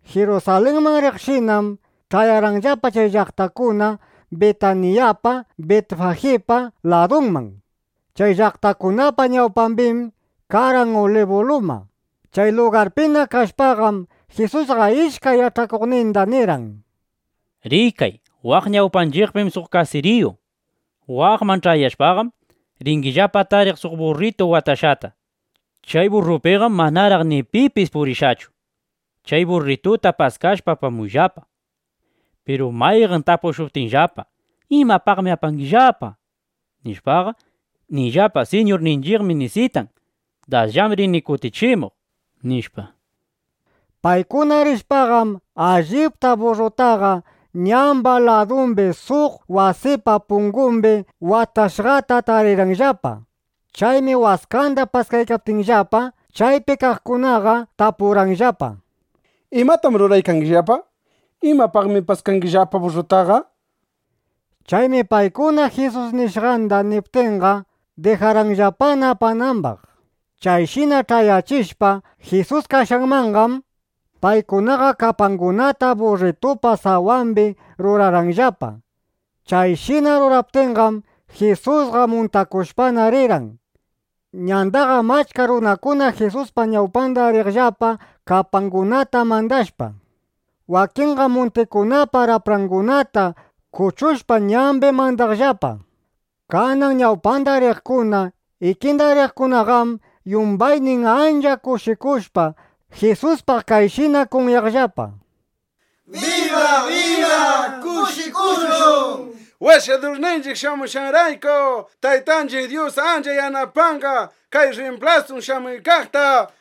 Jirusalinman riqshinam, ch'ayarqanllapa chay llaqtakuna Bitanillapa (Bitaniyapa), Bitfajipa ladunman. Chay llaqtakunapa ñawpambim karqan Ulibu luma. Chay lugarpina kashpaqam, Jisusqa ishkay yach'akuqninda nirqan: —Rikay, waq ñawpanchiqpim suq kasiriyu. Waqman ch'ayashpaqam, ringillapa tariq suq burritu watashqata. Chay burrupiqam manaraq ni pipis purishqachu. Chay burrituta paskashpa, apamuyllapa. Piru mayqan tapushuptinllapa: “¿Imapaqmi apangillapa?” nishpaqa, niyllapa: “Siñurninchiqmi nisitan. Dasllam rin kutichimuq”, nishpa. Paykuna rishpaqam, allipta burrutaqa ñamba ladumbi suq wasipa pungumbi watashqata tarirqanllapa. Chaymi waskanda paskaykaptinllapa, chaypi kaqkunaqa tapurqanllapa: —¿Imatam ruraykangillapa? ¿Imapaqtaq paskangillapa burrutaqa? nishpa. Chaymi paykuna Jisus nishqanda niptinqa, dijarqanllapana apanambaq. Chayshina ch'ayachishpa Jisus kashqanmanqam, paykunaqa kapangunata burritupa sawambi rurarqanllapa. Chayshina ruraptinqam, Jisusqa muntakushpana rirqan. Ñandaqam achka runakuna Jisuspa ñawpanda riqllapa, kapangunata mandashpa. Wakinqam muntikunapa raprangunata kuchushpa, ñambi mandaqllapa. Kanan ñawpanda riqkuna, ikinda riqkunaqam yumbaynin ancha kushikushpa, Jisuspaq kayshina kunyaqllapa: —¡Biba, biba! ¡Kushikushun, Washadurninchiq shamuykashqanrayku! ¡Taytanchiq Dyus ancha yanapanqa kay rrimplasun shamuykaqta!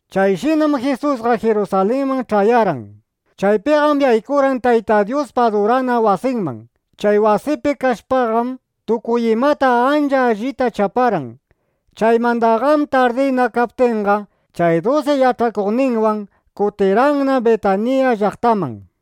Chayshinam Jisusqa Jirusalinman ch'ayarqan. Chaypiqam yaykurqan Tayta Dyuspa adurana wasinman. Chay wasipi kashpaqam, tukuy imata ancha allita chaparqan. Chaymandaqam tardina kaptinqa, chay dusi yach'akuqninwan kutirqanna Bitanilla (Bitaniya) llaqtaman.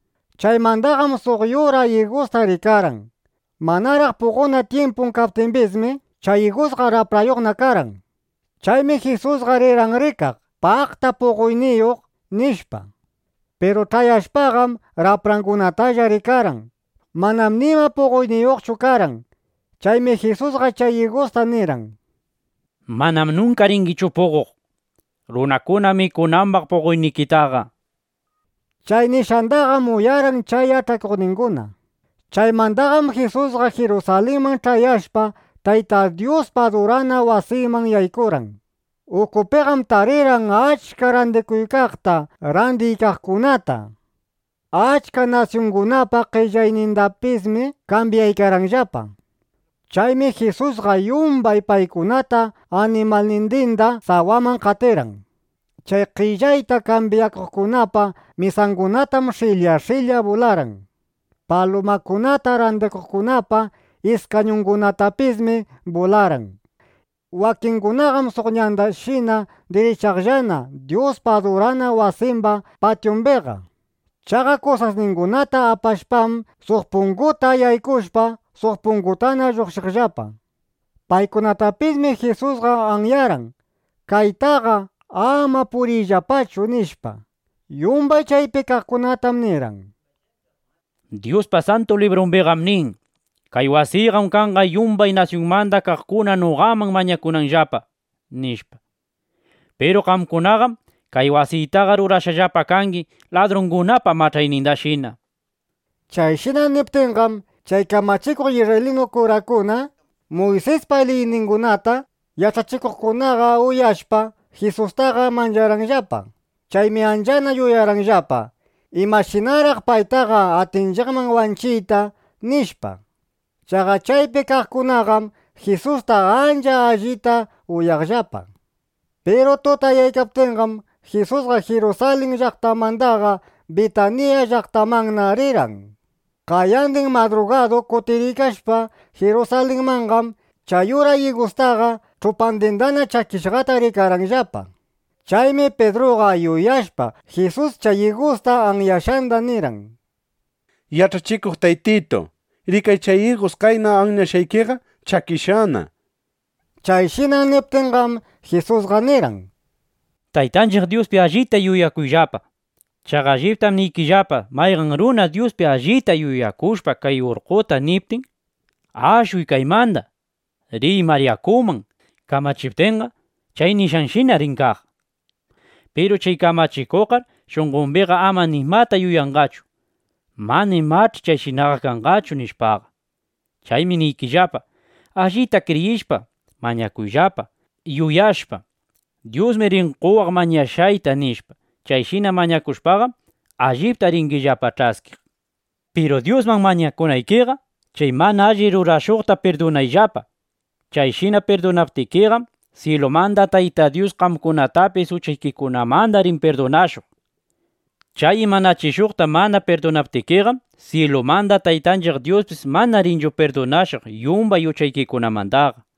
Chaymandaqam suq yura igusta rikarqan. Manaraq puqonan tyimpun kaptimbismi, chay igusqa raprayuqna karqan. Chaymi Jisusqa rirqan rikaq: Paqta puqoyniyuq, nishpa. Piru ch'ayashpaqam, raprangunatalla rikarqan. Manam nima puqoyniyuqchu karqan. Chaymi Jisusqa chay igusta nirqan: —Mananam nunka ringichu puqoq, runakuna mikunambaq puqoynikitaqa, nishpa. Chay nishqandaqam uyarqan chay yach'akuqninguna. Chaymandaqam Jisusqa Jirusalinman ch'ayashpaqa, Tayta Dyuspa adurana wasinman yaykurqan. Ukupiqam tarirqan achka randikuykaqta, randiykaqkunata. Achka nasyungunapa qellaynindapismi kambyaykarqanllapa. Chaymi Jisusqa yumbay paykunata animalnindinda sawaman qatirqan. Chay qellayta kambyakuqkunapa mesangunatam sh'ilya sh'ilya bularqan. Palumakunata randikuqkunapa iskañungunatapismi bularqan. Wakingunaqam suq ñandashina dirichaqllana Dyuspa adurana wasimba patyumbiqa. Chaqa kusasningunata apashpam, suq punguta yaykushpa, suq pungutana lluqshiqllapa. Paykunatapismi Jisusqa anyarqan: —Kaytaqa ama puriyllapachu, nishpa. Yumbay chaypi kaqkunatam nirqan: —Dyuspa Santu Librumbiqam nin: “Kay wasiyqam kanqa yumbay nasyunmanda kaqkuna noqaman mañakunanllapa”, nishpa. Piru qamkunaqam kay wasitaqa rurashqallapa kangi ladrungunapa mach'aynindashina, nishpa. Chayshina niptinqam, chay kamachikuq isrraylinu kurakuna, Muysispa liyningunata yach'achikuqkunaqa uyashpa, Jisustaqa mancharqanllapa. Chaymi anchana yuyarqanllapa: ¿Imashinaraq paytaqa atinchiqman wanchiyta? nishpa. Chaqa chaypi kaqkunaqam Jisusta ancha allita uyaqllapa. Piru tutayaptinqam, Jisusqa Jirusalin llaqtamandaqa Bitanilla (Bitaniya) llaqtamanna rirqan. Qayandin madrugadu kutiriykashpa Jirusalinmanqam, chay yura igustaqa ch'upandinna chakishqata rikarqanllapa. Chaymi Pidruqa yuyashpa Jisus chay igusta anyashqanda nirqan: —Yach'achikuq Taytitu, rikay chay igus qayna anyashqaykiqa chakishqana. Chayshina niptinqam, Jisusqa nirqan: —Taytanchiq Dyuspi allita yuyakuyllapa. Chaqa alliptam niykillapa, mayqan runa Dyuspi allita yuyakushpa kay urqqota niptin: “Ashuy kaymanda. Riy mar yakuman”, kamachiptinqa, chay nishqanshina rin kaq. Piru chay kamachikuqqar shunqombiqa ama nimata yuyanqachu: Mana imach'i chayshinaqa kanqachu, nishpaqa. Chaymi niykillapa, allita kriyishpa mañakuyllapa, yuyashpa: Dyusmi rin qowaq mañashqayta, nishpa. Chayshina mañakushpaqam, allipta ringillapa ch'askiq. Piru Dyusman mañakunaykiqa, chay mana alli rurashuqta pirdunayllapa. Chayshina pirdunaptikiqam, syilumanda Tayta Dyus qamkunatapis uchaykikunamanda rin pirdunashuq. ˻Chay imanachishuqta mana pirdunaptikiqam, syilumanda Taytanchiq Dyuspis mana rinchu pirdunashuq yumbay uchaykimandaqa.˼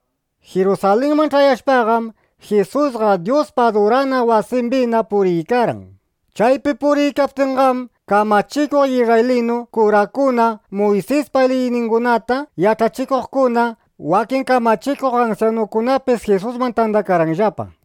Jirusalinman ch'ayashpaqam, Jisusqa Dyuspa adurana wasimbina puriykarqan. Chaypi puriykaptinqam, kamachikuq isrraylinu kurakuna, Muysispa liyningunata yach'achikuqkuna, wakin kamachikuq ansyanukunapis Jisusman tandakarqanllapa.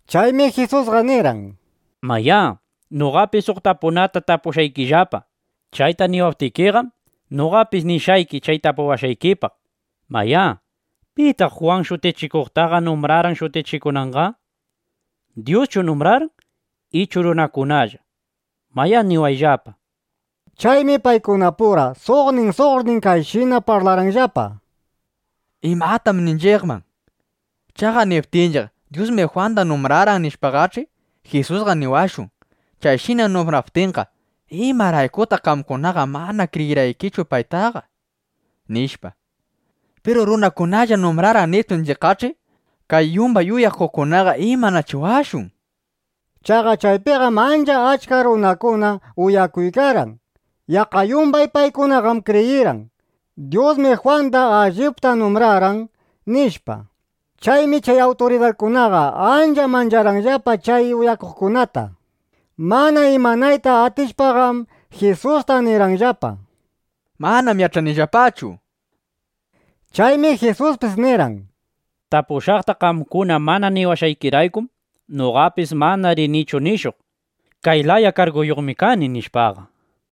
Chaymi Jisusqa nirqan: —Mayá, noqapis suq tapunata tapushqaykillapa. Chayta niwaptikiqam, noqapis nishqayki chay tapuwashqaykipaq. Mayá, ¿pitaq Jwan Shutichikuqtaqa numbrarqan shutichikunanqa? ¿Dyuschu numbrarqan ichu runakunalla? Mayá, niwayllapa, nishpa. Chaymi paykunapura suqnin suqnin kayshina parlarqanllapa: —¿Imatam ninchiqman? Chaqa niptinchiq: “Dyusmi Jwanda numbrarqan”, nishpaqach'i, Jisusqa niwashun: “Chayshina numbraptinqa, ¿imaraykutaq qamkunaqa mana kriyirqaykichu paytaqa?” nishpa. Piru: “Runakunallam numbrarqan”, niptinchiqqach'i, kay yumbay uyakuqkunaqa ¿imanachiwashun? nishpa. Chaqa chaypiqam ancha achka runakuna uyakuykarqan. Yaqqa yumbay paykunaqam kriyirqan: Dyusmi Jwanda allipta numbrarqan, nishpa. Chaymi chay awturidarkunaqa ancha mancharqanllapa chay uyakuqkunata. Mana imanayta atishpaqam, Jisusta nirqanllapa: —Manam yach'anillapachu, nishpa. Chaymi Jisuspis nirqan: —Tapushqaqta qamkuna mana niwashqaykiraykum, noqapis mana rinichu nishuq: “Kay laya karguyuqmi kani”, nishpaqa.